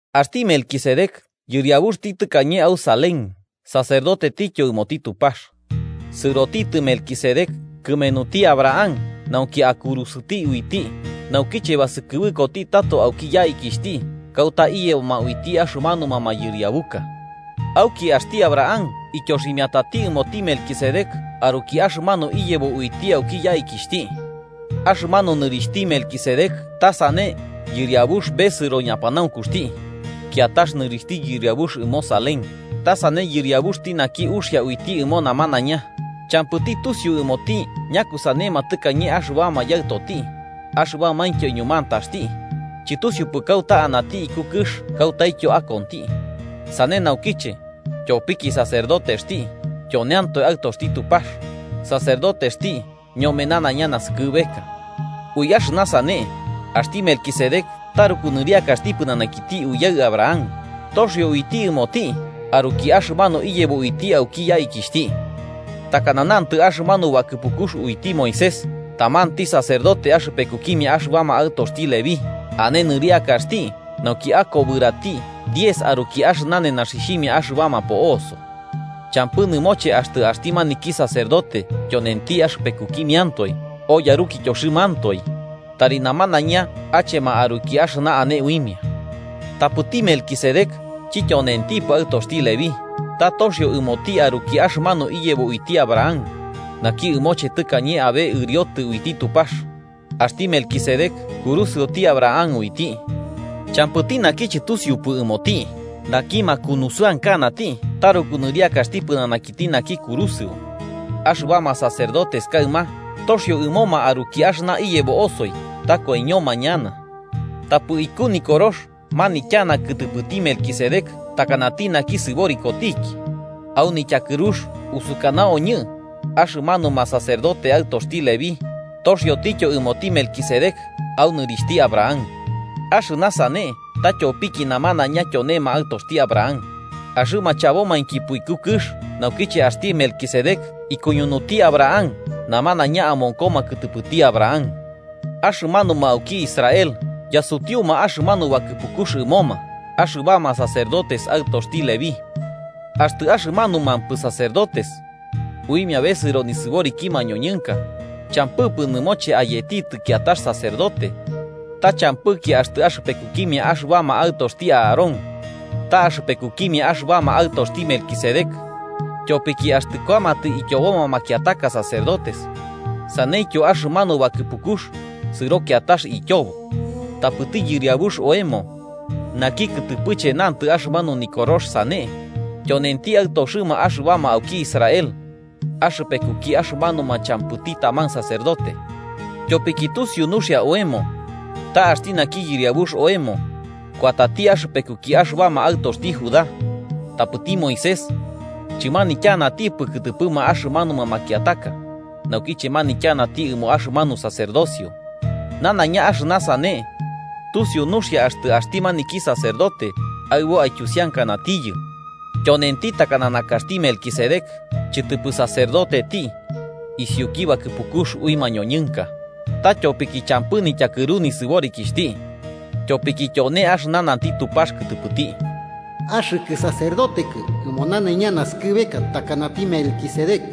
Axti Melquisedec yɨriabuxti tɨkañe au Salem sacerdotetityo ɨmoti Tupax. Sɨrotitɨ Melquisedec kɨmenuti Abraham nauki akurusɨti uiti naukiche basɨkɨbɨkoti tato auki yaikixhti kauta iyeboma uiti axɨmanuma mayɨriabuka. Auki axti Abraham ityoximiatati ɨmoti Melquisedec aruki axɨmanu iyebo uiti auki yaikixhti. Axɨmanu nɨrixhti Melquisedec ta sane “yɨriabux besɨro ñapanaunkuxti”, kiatax nɨrixhti yɨriabux ɨmo Salem, ta sane “yɨriabuxti naki uxia uiti ɨmo namanaiña” Champɨti tusiu ɨmoti ñakusanema tɨkañe axɨbama yaɨtoti, axɨbamaintyo iñumantaxti, chɨtusiupɨ kauta anati iku kɨx kautaityo akonti. Sane naukiche, tyopiki sacerdotexti, tyonentiatoe aɨtoxti Tupax, sacerdotexti ñome nanaiña naskɨbeka. Ui axɨna sane, axti Melquisedec taruku nɨriakaxti pɨnanakiti uyaɨ Abraham toxio uiti ɨmoti aruki axɨmanu iyebo uiti auki yaikixhti. Takana nantɨ axɨmanu bakɨpukux uiti Moisés, tamanti sacerdote axɨpekukimia axɨbama aɨtoxti Leví, ane nɨriakaxti nauki akobɨrati diez aruki axɨna nenaxixhimia axɨbama po'oso. Champɨ nɨmoche axtɨ axti maniki sacerdote tyonenti axɨpekukimiantoe o yarukityoxɨmantoi: tari namanaiña achema aruki axɨna ane uimia. Tapɨti Melquisedec, chityonentipɨ aɨtoxti Leví, ta toxio ɨmoti aruki axɨmanu iyebo uiti Abraham, naki ɨmoche tɨkañe abe ɨriotɨ uiti Tupax. Axti Melquisedec kurusɨoti Abraham uiti. Champɨti naki chɨtusiupɨ ɨmoti, naki makunusɨankanati taruku nɨriakaxti pɨnanakiti naki kurusɨo. Axɨbama sacerdotes kaɨma toxio ɨmoma aruki axɨna iyebo osoi ta koiñoma ñana. Tapɨ iku Nikorox manityana kɨtɨpɨti Melquisedec takanati naki sɨborikotiki. Au nityakɨrux usukanaoñɨ axɨmanuma sacerdote aɨtoxti Leví, toxioityo ɨmoti Melquisedec, au nɨrixhti Abraham. Axɨna sane ta tyopiki namanaiña tyonema aɨtoxti Abraham. Axɨma chabomainkipɨ iku kɨx naukiche axti Melquisedec ikuñunuti Abraham namanaiña amonkoma kɨtɨpɨti Abraham. Axɨmanuma auki Israel yasutiuma axɨmanu bakɨpukux ɨmoma axɨbama sacerdotes aɨtoxti Leví. Axtɨ axɨmanumampɨ sacerdotes uimia bɨsɨro nisɨboriki mañoñɨnka champɨpɨ nɨmoche ayetitɨ kiatax sacerdote, ta champɨki axtɨ axɨpekukimia axɨbama aɨtoxti Aarón ta axɨpekukimia axɨbama aɨtoxti Melquisedec. Tyopiki axtɨ kuamatɨ ityoboma makiataka sacerdotes, saneityo axɨmanu bakɨpukux sɨro kiatax ityobo. Tapɨti Yɨriabux oemo, naki kɨtɨpɨche nantɨ axɨmanu Nikorox sane, tyonenti aɨtoxɨma axɨbama auki Israel, axɨpekuki axɨmanuma champɨti taman sacerdote. Tyopiki tusiu nuxia oemo ta axti naki Yɨriabux oemo kuatati axɨpekuki axɨbama aɨtoxti Judá, tapɨti Moisés chɨmanityanatipɨ kɨtɨpɨma axɨmanuma makiataka naukiche manityanati ɨmo axɨmanu sacerdocio. Nanaiña axɨna sane tusiu nuxia axtɨ axti maniki sacerdote aɨbo aityusiankanatiyɨ tyonenti takana nakaxti Melquisedec, chɨtɨpɨ sacerdoteti isiuki bakɨpukux ui mañoñɨnka, ta tyopiki champɨ nityakɨru nisɨborikixhti. Tyopiki tyone axɨna nanti Tupax kɨtɨpɨti: “Axɨkɨ sacerdotekɨ ɨmo nanaiña naskɨbeka, takanati Melquisedec.”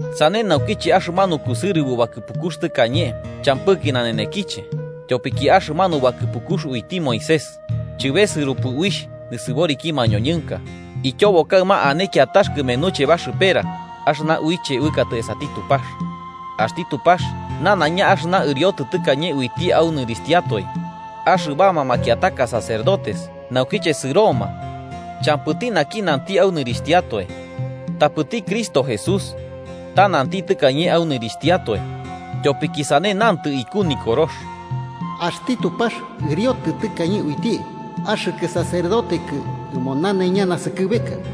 Sane naukiche axɨmanu kusɨrɨbo bakɨpukux tɨkañe champɨki nanenekiche, tyopiki axɨmanu bakɨpukux uiti Moisés chɨbesɨropɨ uixh nisɨboriki mañoñɨnka, ityobo kaɨma ane kiatax kɨmenuche baxɨpera axɨna uiche uɨkatɨ esati Tupax. Axti Tupax nanaiña axɨna ɨriotɨ tɨkañe uiti au nɨrixhtiatoe. Axɨbama makiataka sacerdotes naukiche sɨroma champɨti naki nanti au nɨrixhtiatoe. Apɨti Cristo Jesús ta nanti tɨkañe au nɨrixhtiatoe, tyopiki sane nantɨ iku Nikorox: “Axti Tupax ɨriotɨ tɨkañe uiti: ‘Axɨkɨ sacerdotekɨ ɨmo nanaiña naskɨbeka.’”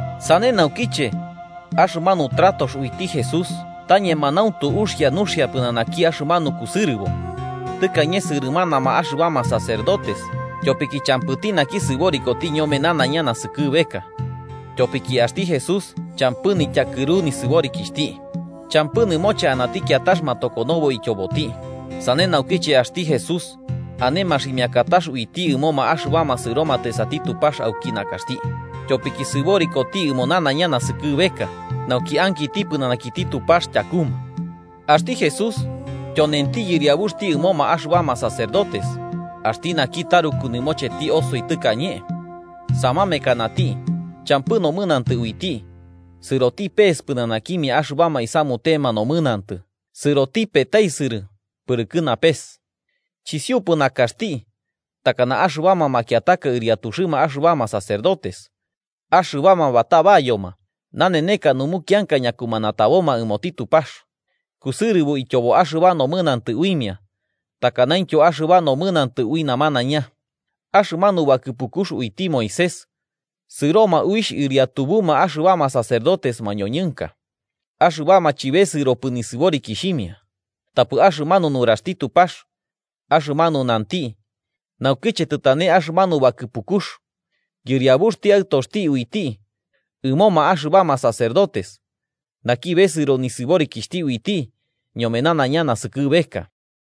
Sane naukiche, axɨmanu tratox uiti Jesús ta ñemanauntu uxia nuxia pɨnanaki axɨmanu kusɨrɨbo. Tɨkañe sɨrɨmanama axɨbama sacerdotes, tyopiki champɨti naki sɨborikoti ñome nanaiña naskɨbeka. Tyopiki axti Jesús champɨ nityakɨru nisɨborikixhti, champɨ nɨmoche anati kiatax matokonobo ityoboti. Sane naukiche axti Jesús ane maximiakatax uiti ɨmoma axɨbama sɨromatɨ esati Tupax auki nakaxti, tyopiki sɨborikoti ɨmo nanaiña naskɨbeka, nauki ankiti pɨnanakiti Tupax tyakuma. Axti Jesús tyonenti yɨriabuxti ɨmoma axɨbama sacerdotes axti naki taruku nɨmocheti osoi tɨkañe. Samamekanati, champɨ nomɨnantɨ uiti, sɨroti pese pɨnanakimia axɨbama isamutema nomɨnantɨ sɨroti petaisɨrɨ pɨrɨkɨ napes. Chisiupɨ nakaxti takana axɨbama makiataka ɨriatuxɨma axɨbama sacerdotes, axɨbama batabayoma naneneka numukianka ñakumanataboma ɨmoti Tupax, kusɨrɨbo ityobo axɨba nomɨnantɨ uimia takanaintyo axɨba nomɨnantɨ ui namanaiña. Axɨmanu bakɨpukux uiti Moisés sɨroma uixh ɨriatubuma axɨbama sacerdotes mañoñɨnka axɨbama chɨbesɨropɨ nisɨborikixhimia. Tapɨ axɨmanu nuraxti Tupax, axɨmanu nanti naukiche tɨtane axɨmanu bakɨpukux, yɨriabuxti Aɨtoxti uiti ɨmoma axɨbama sacerdotes, naki besɨro nisɨborikixhti uiti ñome nanaiña naskɨbeka.